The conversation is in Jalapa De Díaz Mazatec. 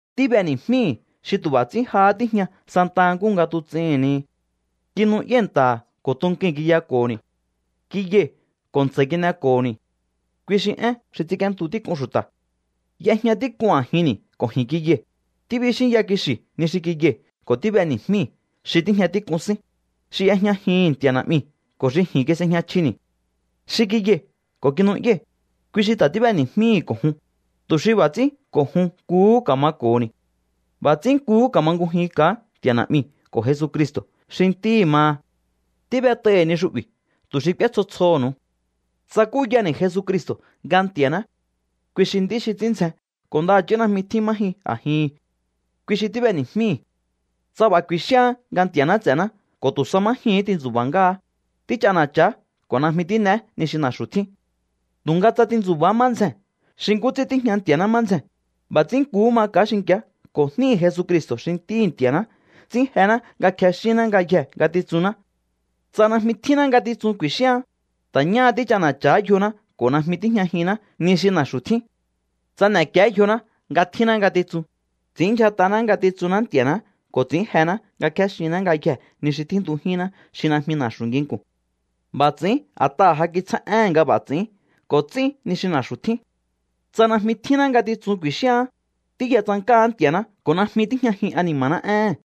Tíb'eni̱jmíi̱hi̱ xi tu̱ b'a̱ ts'ín jahá tíjña santa nkúhu nga tuts'ihi̱n ni. Kinu'yái̱ nta̱ha̱ ko̱ tukui̱n kiyako̱ho̱ni̱. Kiyai̱ ko̱ ntsa̱i̱ kin'eko̱ho̱ni̱. Kui xi Én xi ts'ínk'íéntu tík'un xu̱ta̱. Y'ejña tík'un a̱jinni̱ ko̱ ji̱n kiyai̱. Tíbixínya kixi̱ ni xi kiyai̱ ko̱ tíb'eni̱jmíi̱ xi tíjña tík'un sín, xi y'ejñajihi̱n Nti̱a̱ Na̱'miu̱ ko̱ xi ji̱n kis'ejña chjini̱. Xi kiyai̱ ko̱ kinu'yái̱, kui xi ta̱ tíb'eni̱jmíi̱hi̱ ko̱ jun, tu̱ xi b'a̱ ts'ín ko̱ jun nkuhú ka̱mako̱ho̱ni̱. B'a̱ ts'ín nkuhú ka̱mangujinka̱á Nti̱a̱ Na̱'miu̱ ko̱ Jesucristo̱ xi Ntíhi̱ maha. Tíb'et'ai̱hi̱ ni xu'bi̱ tu̱ xi k'úé tsjo tsjoho̱nu̱u. Tsakúyani̱ Jesucristo̱ nga Nti̱a̱ná, kui xi nd'í xi ts'ín ndzjen ko̱ ndaha̱chí najmi tjín má jyun a̱jihi̱n. Kui xi tíb'eni̱jmíi̱hi̱. Tsa b'a̱ ku̱i̱xíaán nga Nti̱a̱ná ts'e̱ná ko̱ tu̱ sa má jyuu̱hún tintsu̱ba̱ ngáá, tích'ana̱cha̱á ko̱ najmi tín'eé ni xi na̱xu̱ tjín. Tu̱nga tsa tintsu̱ba̱á má ndzjee̱n xi nkú ts'ín tíjña Nti̱a̱ná má ndzjee̱n, b'a̱ ts'ín nkuhú maka̱á xinki̱á ko̱ jníhi̱ Jesucristo̱ xi Ntíhi̱ Nti̱a̱ná ts'ín jená nga kjexínná ngayjee̱ ngatitsunná. Tsa najmi tjínná ngatitsun ku̱i̱xíaán, ta̱ ñáha tích'ana̱cha̱ha̱á yjoná ko̱ najmi tíjñajinná ni xi na̱xu̱ tjín. Tsa n'e̱kié yjoná nga tjínná ngatitsun, ts'i̱ínndyjat'aná ngatitsunná Nti̱a̱ná ko̱ ts'i̱ín jená nga kjéxinná ngayjee̱ ni xi tjíntujínná xi najmi na̱xu̱ nginku̱n. B'a̱ ts'i̱ín a̱t'aha̱ ja kitsjá éhe̱n nga b'a̱ ts'i̱ín ko̱ ts'ín ni xi na̱xu̱ tjín. Tsa najmi tjínná ngatitsun ku̱i̱xíaán, tíya tsank'áá Nti̱a̱ná ko̱ najmi tíjñajin ani̱ma̱ná éhe̱n.